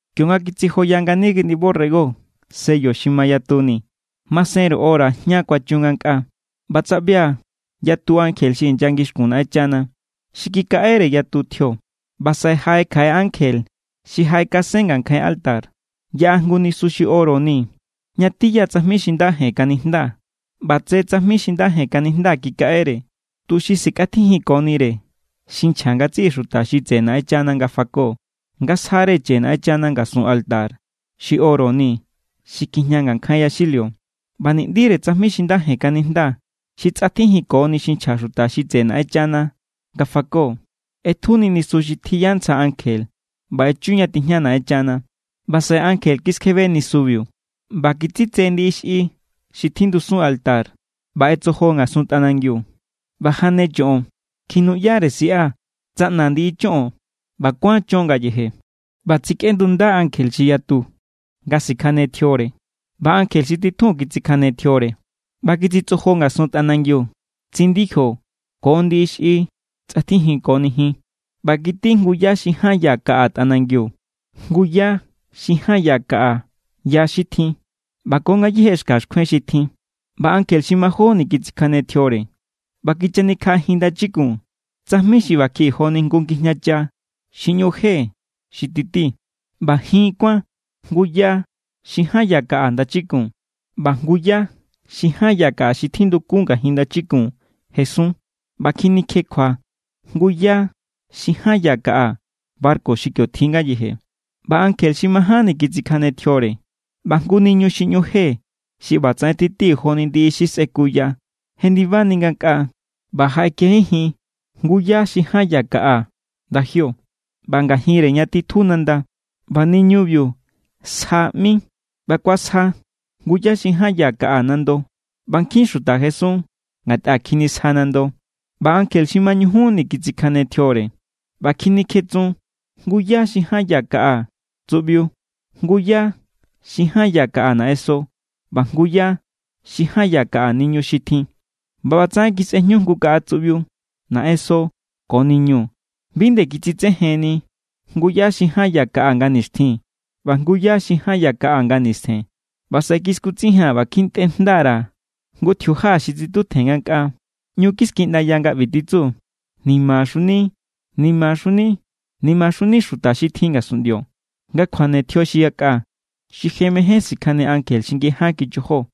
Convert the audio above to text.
Kionga kitsijoya ngani Kiꞌndi borrego sello xi mayatuni, masenru hora jña kuachun ngankꞌaa. ꞌBa tsaꞌbia̱ yatu ankje xi inya ngixkun Naꞌenchana. Xi kikaꞌere yatu tjio. ꞌBa saꞌe jaꞌe kjaꞌe ankje xi jaꞌekasen ngankjain altar. Yaꞌa jngu nisu xi oro ni ña tiya tsajmi xi nda jen kanijnda. ꞌBa tse tsajmi xi nda jen kanijnda kikaꞌere, tuxi sikꞌatjijinkonire xi nchja ngatsiꞌi xuta xi tseꞌe Naꞌenchana nga fako, nga sjare chje Naꞌenchana ngasun altar xi oro ni xi kjijña ngankjain yaxilio. ꞌBa ni̱ꞌndire tsajmi xi nda jen kanijnda xi tsꞌatjijinkoni xi nchja xuta xi tseꞌe Naꞌenchana nga fako ꞌetjuni nisu xi tjiya ntsja ankje ꞌba echu ña tijña Naꞌenchana. ꞌBa saꞌe ankje kiskjebe nisubiu ꞌba kitsitse ndiꞌi xꞌi xi tjindusun altar ꞌba ꞌetsojo ngasun tꞌanangiu. ꞌBa jane choꞌon, kjinuꞌyare siꞌa, tsaꞌna ndiꞌi choꞌon ꞌba kuán chon ngayeje. ꞌBa tsikꞌendunda ankje xi yatu nga sikjane tjiore. ꞌBa ankje xi titjun kitsikjane tjiore, ꞌba kititsojo ngasun tꞌanangiu tsindijo ko ndiꞌi xi tsꞌatjijinkoni jin. ꞌBa kití jngu yá xi ján ya kaꞌa tꞌanangiu, jngu yá xi ján ya kaꞌa ya xi tjin ꞌba ko ngayéje xka xkjuen xi tjin. ꞌBa ankje xi majóni kitsikjane tjiore, ꞌba kichanikjaꞌajin ndachikun tsajmi xi ꞌbakjiꞌi joni jngu ngijñacha xi ꞌñu je xi tití, ꞌba jin kuán jngu yá xi ján ya kaꞌa ndachikun. ꞌBa jngu yá xi ján ya kaꞌa xi tjindukun ngajin ndachikun jesun, ꞌba kjinikjekjua jngu yá xi ján ya kaꞌa barku xi kio tjin ngayeje. ꞌBa ankje xi majánni kitsikjane tjiore, ꞌba jngu niñu xi ꞌñu je xi ꞌbatsaꞌen titi joni ndiꞌi xi sꞌekuya jendibani ngankꞌaa ꞌba jaꞌekejenjin jngu yá xi ján ya kaꞌa ndajio ꞌba ngajinre ña titju nanda. ꞌBa niñubiu Sja ꞌmi, ꞌba kuasja jngu yá xi ján ya kaꞌa nando. ꞌBa nkjin xuta jesun ngatꞌa kjinisja nando. ꞌBa ankje xi mañujunni kitsikjane tjiore, ꞌba kjinikjetsun jngu yá xi ján ya kaꞌa tsuꞌbiu, jngu yá xi ján ya kaꞌa naꞌenso ꞌba jngu yá xi ján ya kaꞌa niñu xi tjin. ꞌBa ꞌbatsaꞌen kisꞌejñu jngu kaꞌa tsuꞌbiu, naꞌenso ko niñu. Bi nde kitsitsejenni jngu yá xi ján ya kaꞌa nga nixtjin ꞌba jngu yá xi ján ya kaꞌa nga nistjen. ꞌBa saꞌe kiskutsijia̱n ꞌba kjintꞌe jnda_ra̱ jngu tjiuja xi titutjen ngankꞌaa. ꞌÑu kiskiꞌndaya nga ꞌbi titsu: “¡Nimaxuni, nimaxuni, nimaxuni xuta xi tjin ngasunꞌndio, nga kjuane tjio xi yakꞌa, xi je mején sikjane ankje xi ngiján kichojo!”